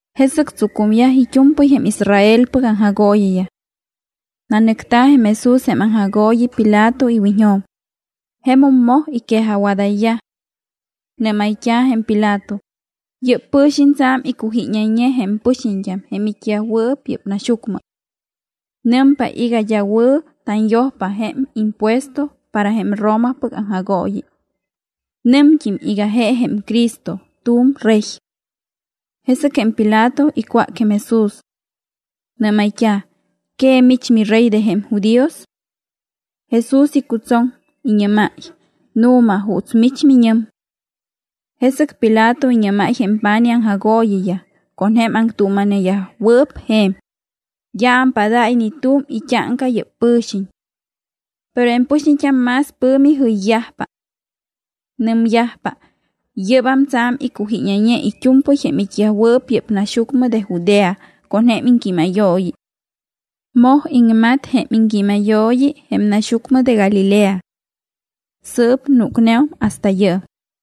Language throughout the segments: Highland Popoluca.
Jesɨc tsucumyaj it́u̱mpɨy jém Israelpɨc aŋjagooyiyaj. Nanɨcta̱ jém Jesús jém aŋjagooyi Pilato iwiñjo̱m. Jemum moj iquejajwadayyaj. Nɨ́mayt́a̱ jém Pilato: —Yɨ́p pɨ̱xiñ tsa̱m iccujíñayñe jém pɨxiñt́am jém it́yajwɨɨp yɨ́p naxyucmɨ. Nɨmpa iga d́a wɨ̱ tanyojpa jém impuesto para jém Romapɨc aŋjagooyi. Nɨmt́im iga je jém Cristo, tu̱m Rey. Jesɨc jém Pilato icwác jém Jesús. Nɨ́mayt́a̱: —¿Que mich miRey de jém judíos? Jesús icutsoŋ, iñɨ́máy: —Nu̱ma juuts mich miñɨm. Jesɨc Pilato iñɨ́máy jém pa̱nij aŋjagooyiyaj con jém aŋtuuma̱neyajwɨɨp je̱m: —D́a ampádáy ni tu̱m it́áŋca yɨ́p pɨ̱xiñ. Pero jém pɨxiñt́am más pɨ̱mi jɨyyajpa. Nɨmyajpa: —Yɨ́bam tsa̱m icujíñayñe it́u̱mpɨy jém it́yajwɨɨp yɨ́p naxyucmɨ de Judea con jém iŋquímayooyi. Moj iŋmat jém iŋquímayooyi jém naxyucmɨ de Galilea. Sɨɨp núcneum hasta yɨɨm.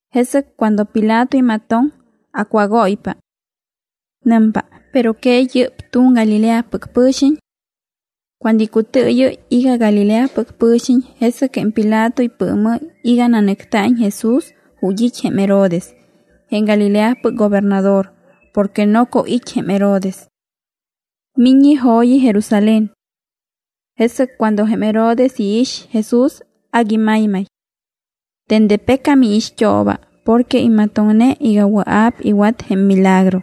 Jesɨc cuando Pilato imatoŋ, acwágóypa. Nɨmpa: —¿Pero que yɨ́p tu̱m Galileapɨc pɨ̱xiñ? Cuando icutɨɨyɨ́y iga Galileapɨc pɨ̱xiñ, jesɨc jém Pilato ipɨɨmɨ́y iga nanɨcta̱iñ Jesús ju̱t́ it́ jém Herodes, jém Galileapɨc gobernador, porque noco it́ jém Herodes. Miññe jo̱yi Jerusalén. Jesɨc cuando jém Herodes iix Jesús, agui maymay. Dende pecam iixt́ooba porque imatoŋne iga wɨa̱p iwat jém milagro.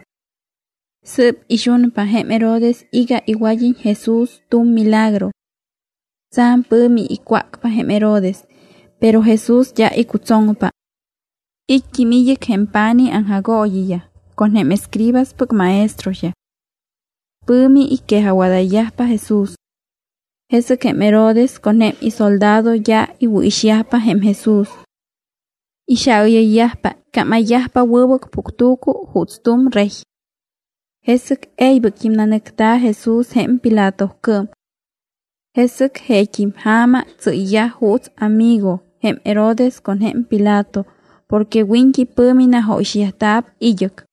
Sɨɨp ixunpa jém Herodes iga iwad́iñ Jesús tu̱m milagro. Tsa̱m pɨ̱mi icwácpa jém Herodes, pero Jesús d́a icutsoŋpa. It́t́im id́ɨc jém pa̱nij aŋjagooyiyaj con jém escribaspɨc maestroyaj. Pɨ̱mi iquejajwadayyajpa Jesús. Jesɨc jém Herodes con jém isoldado d́a iwɨ̱ixyajpa jém Jesús. Ixaayɨyyajpa, iccámayyajpa wɨbɨc puctu̱cu juuts tu̱m rey. Jesɨc e̱ybɨct́im nanɨcta̱ Jesús jém Pilatocɨɨm. Jesɨc jeet́im ja̱ma tsɨ́yyaj juuts amigo jém Herodes con jém Pilato, porque wiñt́i pɨ̱mi najóyixyajta̱p id́ɨc.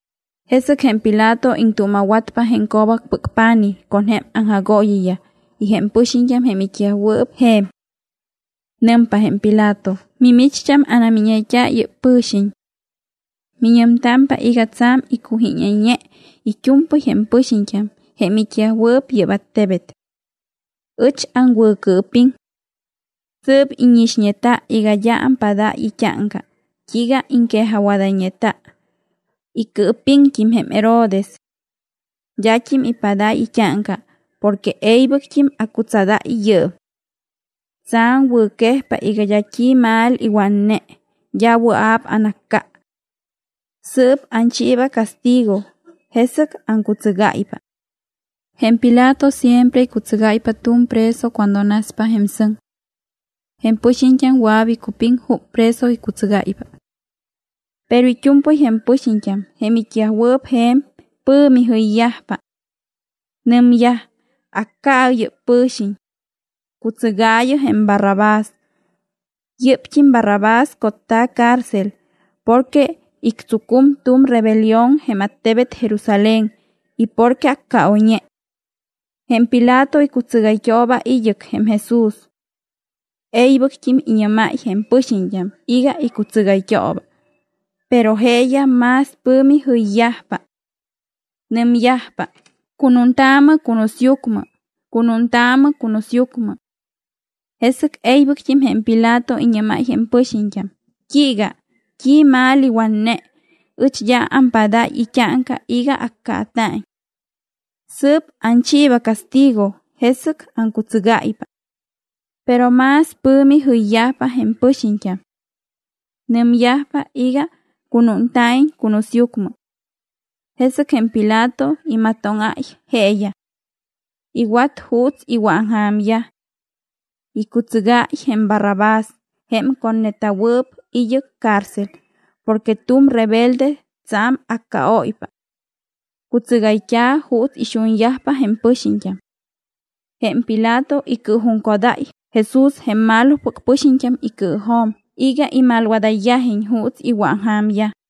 Jesɨc jém Pilato iŋtuuma̱watpa jém co̱bacpɨc pa̱nij con jém aŋjagooyiyaj y jém pɨxiñt́am jém it́yajwɨɨp je̱m. Nɨmpa jém Pilato: —Mimicht́am anamíñayt́a yɨ́p pɨ̱xiñ. Miñɨmtámpa iga tsa̱m iccujíñayñe it́u̱mpɨy jém pɨxiñt́am jém it́yajwɨɨp yɨ́p attebet. Ɨch aŋwɨ̱cɨɨpiŋ. Sɨɨp íñixñeta iga d́a ampádáy it́áŋca t́iiga iŋquejajwadayñeta. Icɨɨpiŋt́im jém Herodes. D́at́im ipádáy it́áŋca porque e̱ybɨct́im acutsadáy yɨɨm. Tsa̱m wɨ̱quejpa iga d́a t́i mal iwatne, d́a wɨa̱p anacca. Sɨɨp anchiiba castigo, jesɨc aŋcutsɨgáypa. Jém Pilato siempre icutsɨgáypa tu̱m preso cuando naspa jém sɨŋ. Jém pɨxiñt́am wɨa̱p icupiŋ jup preso icutsɨgáypa. Pero it́u̱mpɨy jém pɨxiñt́am, jém it́yajwɨɨp je̱m, pɨ̱mi jɨyyajpa. Nɨmyaj: —¡Acca̱ɨ yɨ́p pɨ̱xiñ! ¡Cutsɨgaayɨ jém Barrabás! Yɨ́pt́im Barrabás cotta̱ cárcel porque ictsucum tu̱m rebelión jém attebet Jerusalén y porque accaoyñe. Jém Pilato icutsɨgayt́ooba id́ɨc jém Jesús. E̱ybɨct́im iñɨ́máy jém pɨxiñt́am iga icutsɨgayt́ooba. Pero jeeyaj más pɨ̱mi jɨyyajpa. Nɨmyajpa: —¡Cunuuntaamɨ cunusyucmɨ! ¡Cunuuntaamɨ cunusyucmɨ! Jesɨc e̱ybɨct́im jém Pilato iñɨ́máy jém pɨxiñt́am: —¿T́iiga? ¿T́i mal iwatne? Ɨch d́a ampádáy it́áŋca iga accaata̱iñ. Sɨɨp anchiiba castigo, jesɨc aŋcutsɨgáypa. Pero más pɨ̱mi jɨyyajpa jém pɨxiñt́am. Nɨmyajpa iga cunúnta̱iñ cunusyucmɨ. Jesɨc jém Pilato imatóŋáy jeeyaj. Iwat juuts iwɨ̱aŋja̱myaj. Icutsɨgáy jém Barrabás jém cotneta̱wɨɨp id́ɨc cárcel porque tu̱m rebelde, tsa̱m accaóypa. Cutsɨgayt́a̱ juuts ixunyajpa jém pɨxiñt́am. Jém Pilato icɨɨjuŋcodáy Jesús jém malopɨc pɨxiñt́am icɨɨjo̱m iga imalwadayyajiñ juuts iwɨ̱aŋja̱myaj.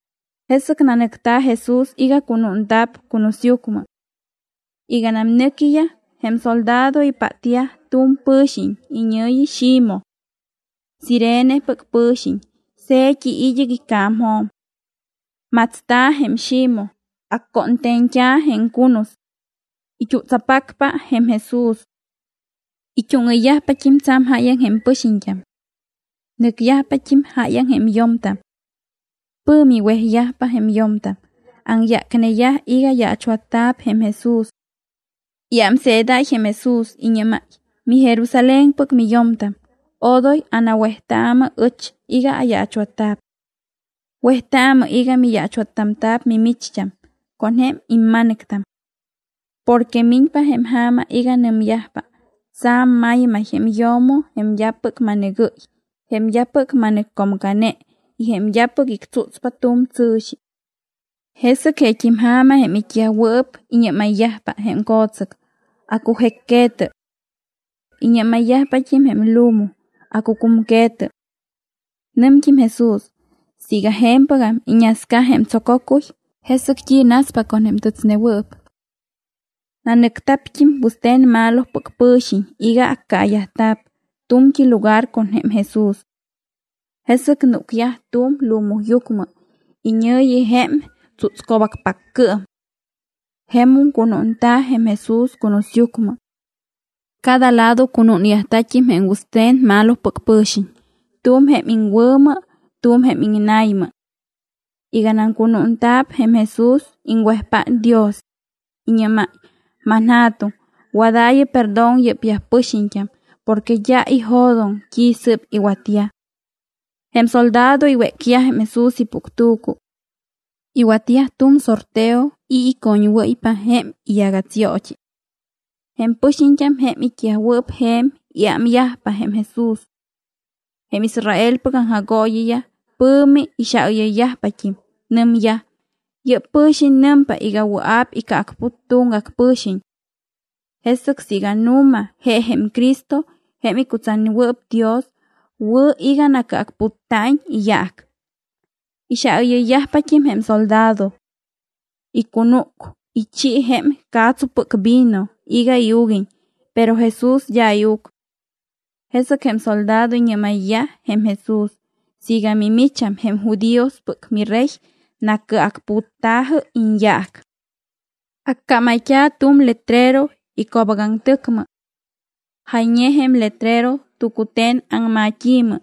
Jesɨc nanɨcta̱ Jesús iga cunúnta̱p cunusyucmɨ. Iganam nɨquiyaj, jém soldado ipátyaj tu̱m pɨ̱xiñ iñɨ̱yi Ximoj. Cirenepɨc pɨ̱xiñ, se̱t́i id́ɨc ica̱mjo̱m. Matsta̱ jém Ximoj, accónte̱ñt́a̱ jém cunus. It́utsapacpa jém Jesús. It́úŋɨyyajpat́im tsa̱m jáyaŋ jém pɨxiñt́am. Nɨcyajpat́im jáyaŋ jém yo̱mtam. Pɨ̱mi wejyajpa jém yo̱mtam, aŋyácneyaj iga yaachwatta̱p jém Jesús. Iámseedáy jém Jesús. Iñɨ́máy: —MiJerusalénpɨc miyo̱mtam, odoy anawejtaamɨ ɨch iga ayaachwatta̱p. Wejtaamɨ iga miyaachwattamta̱p mimicht́am con jém imma̱nɨctam. Porque miñpa jém ja̱ma iga nɨmyajpa: “Tsa̱m maymay jém yo̱mo jém d́apɨc ma̱nɨgɨ́y, jém d́apɨc ma̱nɨccomcane y jém d́apɨc ictsútspa tu̱m tsɨ̱xi.” Jesɨc jeet́im ja̱ma jém it́yajwɨɨp iñɨ́mayyajpa jém co̱tsɨc: “Acujécque̱tɨ.” Iñɨ́mayyajpat́im jém lumu: “Accucumque̱tɨ.” Nɨmt́im Jesús: —Siiga je̱mpɨgam iñasca jém tsococuy, ¿jesɨc t́i naspa con jém tɨtsnewɨɨp? Nanɨcta̱pt́im wɨste̱n malopɨc pɨ̱xiñ iga accaayajta̱p tu̱mt́i lugar con jém Jesús. Jesɨc núcyaj tu̱m lumuyucmɨ, iñɨ̱yi jém Tsútsco̱bacpaccɨɨm. Jemum cunúnta̱ jém Jesús cunusyucmɨ. Cada lado cunúnyajta̱t́im jém wɨste̱n malopɨc pɨ̱xiñ, tu̱m jém iŋwɨ̱mɨ, tu̱m jém iŋna̱ymɨ. Iganam cunúnta̱p jém Jesús, iŋwejpát Dios. Iñɨ́máy: —ManJa̱tuŋ, wadaayɨ perdón yɨ́pyaj pɨxiñt́am porque d́a ijo̱doŋ t́i sɨ́p iwatyaj. Jém soldado iwécyaj jém Jesús ipuctu̱cu. Iwatyaj tu̱m sorteo i̱ icoñwɨ́ypa jém iyagatsyoot́i. Jém pɨxiñt́am jém it́yajwɨɨp je̱m, iámyajpa jém Jesús. Jém Israelpɨc aŋjagooyiyaj pɨ̱mi ixaayɨyyajpat́im. Nɨmyaj: —Yɨ́p pɨ̱xiñ nɨmpa iga wɨa̱p icɨacput tuŋgac pɨ̱xiñ. Jesɨc siiga nu̱ma je jém Cristo, jém icutsatnewɨɨp Dios, wɨ̱ iga nacɨacputta̱iñ iyaac. Ixaayɨyyajpat́im jém soldado. Icunúc, ichi jém ca̱tsupɨc vino iga iuguiñ, pero Jesús d́a iuc. Jesɨc jém soldado iñɨ́mayyaj jém Jesús: —Siiga mimicham jém judíospɨc miRey, nacɨacputta̱jɨ iñyaac. Accámayt́a̱ tu̱m letrero ico̱bacaŋtɨcmɨ. Jayñe jém letrero tucute̱n aŋmat́i̱mɨ,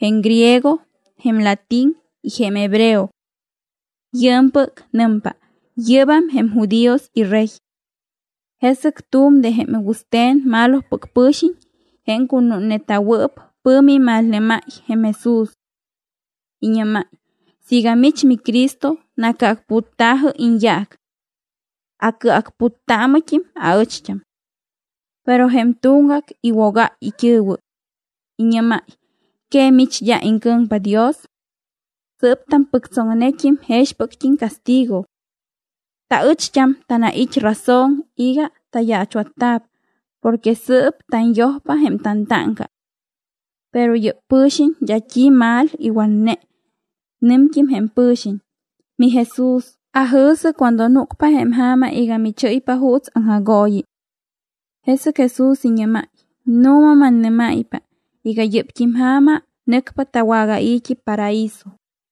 jém griego, jém latín y jém hebreo. Yɨɨmpɨc nɨmpa: “Yɨ́bam jém judíos iRey.” Jesɨc tu̱m de jém wɨste̱n malopɨc pɨ̱xiñ, jém cunúnneta̱wɨɨp, pɨ̱mi imalnɨ́máy jém Jesús. Iñɨ́máy: —Siiga mich miCristo, nacɨacputta̱jɨ iñyaac. Acɨacputtaamɨt́im aɨcht́am. Pero jém tuŋgac iwogáy it́ɨ̱wɨ. Iñɨ́máy: —¿Que mich d́a iŋcɨ̱ŋpa Dios? Sɨɨp tampɨctsoŋnet́im jexpɨct́im castigo. Taɨcht́am tanait́ razon iga tayaachwatta̱p porque sɨɨp tanyojpa jém tantáŋca. Pero yɨ́p pɨ̱xiñ d́a t́i mal iwatne. Nɨmt́im jém pɨ̱xiñ: —MiJesús, ajɨ̱sɨ cuando núcpa jém ja̱ma iga michɨ́ypa juuts aŋjagooyi. Jesɨc Jesús iñɨ́máy: —Nu̱ma mannɨ́máypa iga yɨ́pt́im ja̱ma nɨcpa tawagai̱t́i paraíso.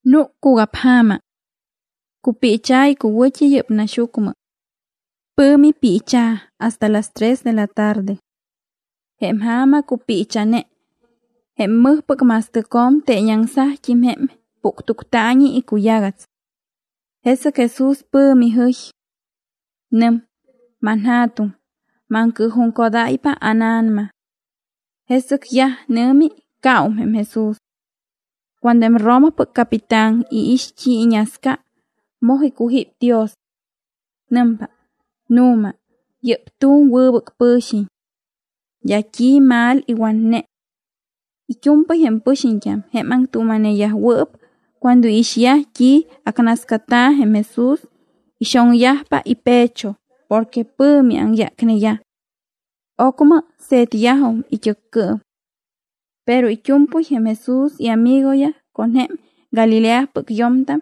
Núc cugapja̱ma. Cupiicha̱ icuwɨ̱t́i yɨ́p naxyucmɨ. Pɨ̱mi piicha̱ hasta las tres de la tarde. Jém ja̱ma cupiicha̱ne. Jém mɨjpɨc ma̱stɨcjo̱m teeñaŋsajt́im jém puctuctaañi icuyagats. Jesɨc Jesús pɨ̱mi jɨy. Nɨm: —ManJa̱tuŋ, maŋcɨɨjuŋcodáypa ána̱nama. Jesɨc yaj nɨ̱mi, caum jém Jesús. Cuando jém Romapɨc capitán iix t́i iñasca, moj icujíp Dios. Nɨmpa: —Nu̱ma, yɨ́p tu̱m wɨbɨc pɨ̱xiñ. D́a t́i mal iwatne. It́u̱mpɨy jém pɨxiñt́am, jém aŋtuuma̱neyajwɨɨp, cuando iixyaj t́i acnascata̱ jém Jesús, ixoŋyajpa ipecho porque pɨ̱mi aŋyácneyaj. Ocmɨ se̱tyajum it́ɨccɨɨm. Pero it́u̱mpɨy jém Jesús iamigoyaj con jém Galileapɨc yo̱mtam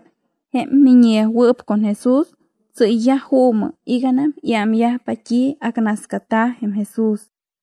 jém miññeyajwɨɨp con Jesús, tsɨ́yyaj juumɨ iganam iámyajpa t́i acnascata̱ jém Jesús.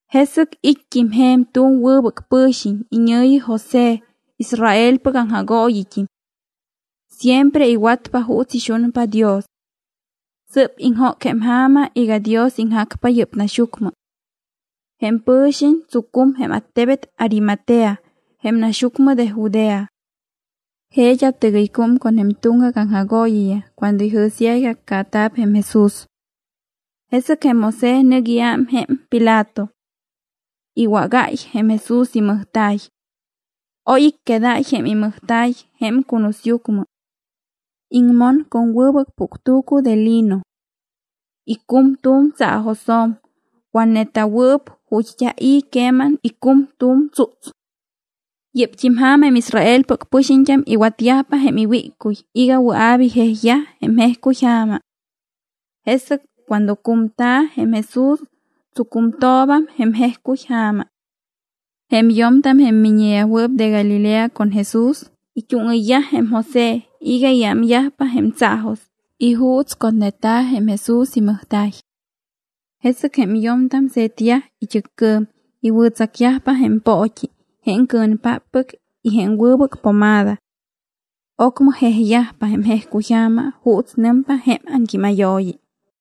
Jesɨc it́t́im je̱m tu̱m wɨbɨc pɨ̱xiñ iñɨ̱yi José, Israelpɨc aŋjagooyit́im. Siempre iwatpa juuts ixunpa Dios. Sɨ́p iŋjóc jém ja̱ma iga Dios iŋjacpa yɨ́p naxyucmɨ. Jém pɨ̱xiñ tsucum jém attebet Arimatea, jém naxyucmɨ de Judea. Je d́a tɨgɨycúm con jém tuŋgac aŋjagooyiyaj cuando ijɨ̱syaj iga accaata̱p jém Jesús. Jesɨc jém José nɨc iám jém Pilato. Iwágáy jém Jesús imɨjta̱y. Oy icquedáy jém imɨjta̱y jém cunusyucmɨ. Iŋmon con wɨbɨc puctu̱cu de lino. Icum tu̱m tsaajosjo̱m, watneta̱wɨɨp, ju̱t́ d́a i̱ queman icum tu̱m tsúts. Yɨ́pt́im ja̱ma jém Israelpɨc pɨxiñt́am iwatyajpa jém iwíccuy iga wɨa̱p ijejyaj jém jejcuyja̱ma. Jesɨc cuando cumta̱ jém Jesús, tsucumtooba jém jejcuy ja̱ma. Jém yo̱mtam, jém miññeyajwɨɨp de Galilea con Jesús, it́úŋɨyyaj jém José iga iámyajpa jém tsaajos y juuts cotneta̱ jém Jesús imɨjta̱y. Jesɨc jém yo̱mtam se̱tyaj it́ɨccɨɨm, iwɨ̱tsacyajpa jém poot́i jém cɨ̱npáppɨc y jém wɨbɨc pomada. Ocmɨ jejyajpa jém jejcuyja̱ma juuts nɨmpa jém aŋquímayooyi.